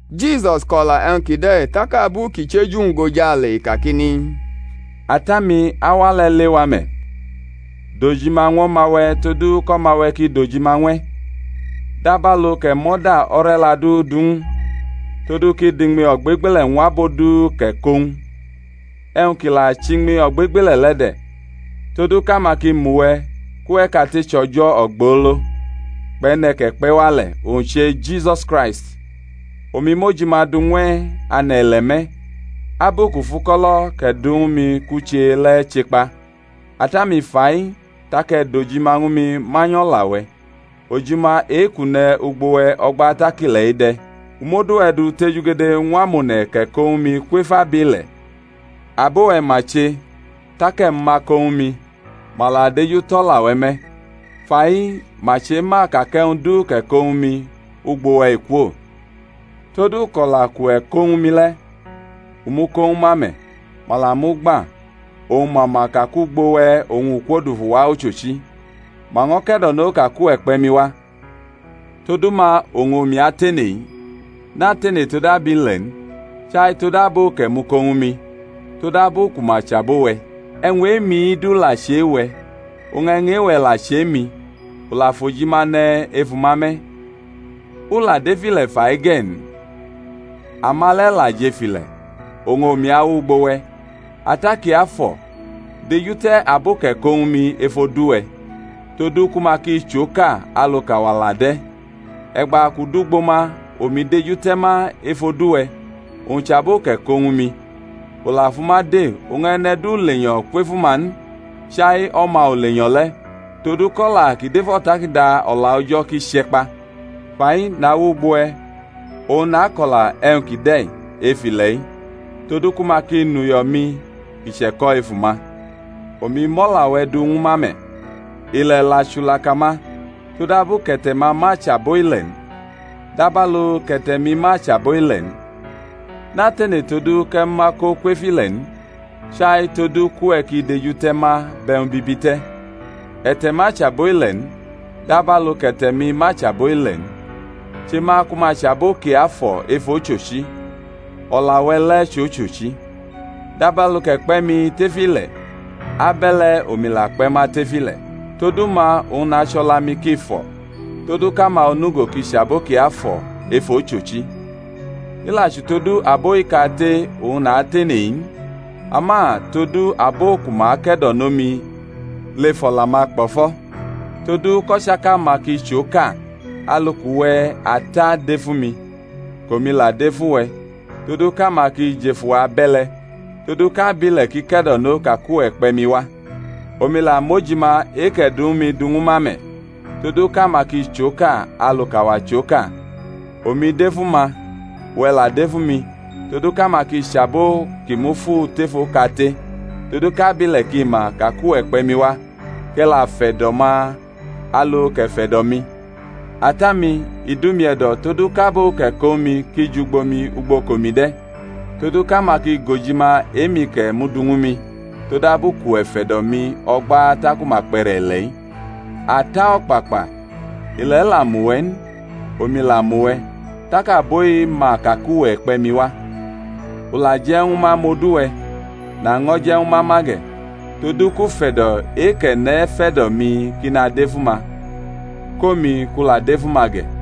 Jisus ko̩la e̩wñ kide̩ tak abu kʼi chʼeju-wñ gʼojale i kakini, Ata-mi, auwa le̩ lewa me̩; dʼojima ñw O̩ma-we̩ todu kʼO̩ma-we̩ ki dʼojima ñw e̩; dabalu kʼe̩ mʼo̩da o̩re̩la du du ñw u, todu kʼi dʼiñmi ogbegbele̩ ñw abo du kʼe̩ ko ñw u. E̩wñ ki la chʼiñmi ogbegbele̩ le̩ de̩, todu kʼama ki mʼuwe̩ kʼuwe̩ kate chʼO̩jo̩ ogbolo, kpʼe̩ne̩ kʼe̩ kpe̩ wa le̩—owñ che Jisus Kraist. Omi mʼojima du ñw e̩ ane̩-ile̩ me̩; abu kʼu fʼuko̩lo̩ kʼe̩ du ñwu mi kʼu che le̩ che kpa; Ata-mi, fa-i tak e̩ dʼojima ñwu mi manyʼO̩la-we̩, ojima e-kʼu ne̩ ugbo we̩ o̩gba tak ile̩ de̩. U mʼodu-we̩ du tejugede ñw amone̩ kʼe̩ ko ñwu mi kwef abile̩. Abo-we̩ ma che; tak e̩ mʼuma ko ñwu mi, ma la dejutʼo̩la-we̩ me̩. Fa-i ma chema ka kʼe̩wñ du kʼe̩ ko ñwu mi, ugbo we̩ i kwo. Tod uko̩la kʼuwe̩ ko ñwu mi le̩, u mʼu ko ñwu ma me̩, ma la mʼu gba, oñ ma ma ka kʼugbo we̩ u kwodufu wa ochochi, ma ño̩ ke̩do̩no ka kʼuwe̩ kpe̩ mi wa. Todu ma oñ omi atene-i; natene tod abile̩ n, chai tod abo kʼe̩ muko ñwu mi, todabu ku ma chʼabo-we̩. E̩wñ e-mi du la chʼe-we̩, e̩wñ e-we̩ la chʼe-mi; u la fʼojima ne̩ efu-ma me̩. U la dʼef ile̩ fa-i ge̩ n, ama le̩ la jʼef ile̩, oñ omi awʼugbo we̩. Ata Kiafo̩, dejute̩ abo kʼe̩ ko ñwu mi ef odu-we̩, todu ku ma ki chʼoka, alu kʼawa la de̩. E̩gba kʼu dʼugbo ma omi dejute̩ ma ef odu-we̩, owñ chʼabo kʼe̩ ko ñwu mi, u la fʼuma de, oñ e̩ne̩ du lenyo̩ kwefu ma n, chai o̩ma ulenyo̩ le̩—todu kʼo̩la ki dʼef O̩takada O̩la O̩jo̩ ki che̩ kpa. Fa-i nawʼugbo we̩; oñ nako̩la e̩wñ kide̩ ef ile̩-i todu ku ma ki nʼuyo̩-mi kʼi che̩ko̩ efu-ma. Omi mʼo̩la-we̩ du ñwu ma me̩, ile̩ la chulaka ma, todabu kʼe̩te̩-ma ma chʼabo ile̩ n, dabalu kʼe̩te̩-mi ma chʼabo ile̩ n. Natene todu kʼe̩ mʼuma ko kwef ile̩ n, chai todu kʼuwe̩ ki dejute̩ ma bʼe̩wñ bibi te̩. E̩te̩-ma chʼabo ile̩ n, dabalu kʼe̩te̩-mi ma chʼabo ile̩ n. Che ma ku ma chʼabo kiafo̩ ef ochochi; o̩la-we̩ le̩ chʼochochi. Dabalu kʼe̩ kpe̩ mi tef ile̩, abe̩le̩ omi la kpe̩ ma tef ile̩; todu ma oñ nache o̩la-mi ki fo̩, todu kʼama onugo ki chʼabo kiafo̩ ef ochochi. I la chʼutodu abo-i kate oñ natene-i n, ama todu abo ku ma ake̩do̩no mi lef o̩la-ma kpo̩fo̩, todu kʼo̩chaka-ma ki chʼoka, alu kʼuwe̩, Ata, dʼef umi, kʼomi la dʼef uwe̩, todu kʼama ki jʼef uwa abe̩le̩, todu kʼabile̩ ki ke̩do̩no ka kʼuwe̩ kpe̩ mi wa. Omi la mʼojima e-kʼe̩ du ñwu mi du ñwu ma me̩, todu kʼama ki chʼoka alu kʼAwa chʼoka. Omi dʼef uma, uwe̩ la dʼef umi, todu kʼama ki chʼabo ki mufu tef okate, todu kʼabile̩ ki ma ka kʼuwe̩ kpe̩ mi wa, kʼe̩ la fe̩do̩ ma alu kʼe̩ fe̩do̩ mi. Ata-mi, i dʼumi e̩do̩ todu kʼabo kʼe̩ ko ñwu mi ki jʼugbo mi ugbo kʼomi de̩, todu kʼama ki gʼojima e-mi kʼe̩ mudu ñwu mi, todabu kʼuwe̩ fe̩do̩ mi o̩gba taku ma kpʼe̩re̩ ile̩-i. Ata o̩kpakpa, ile̩ la mʼuwe̩ n, omi la mʼuwe̩, tak abo-i ma ka kʼuwe̩ kpe̩ mi wa. U la je̩ ñwu ma mʼodu-we̩, naño̩ je̩ ñwu ma ma ge̩; todu kʼufe̩do̩ e-kʼe̩ ne̩ fe̩do̩ mi ki nadʼef uma, kʼomi kʼu la dʼef uma ge̩.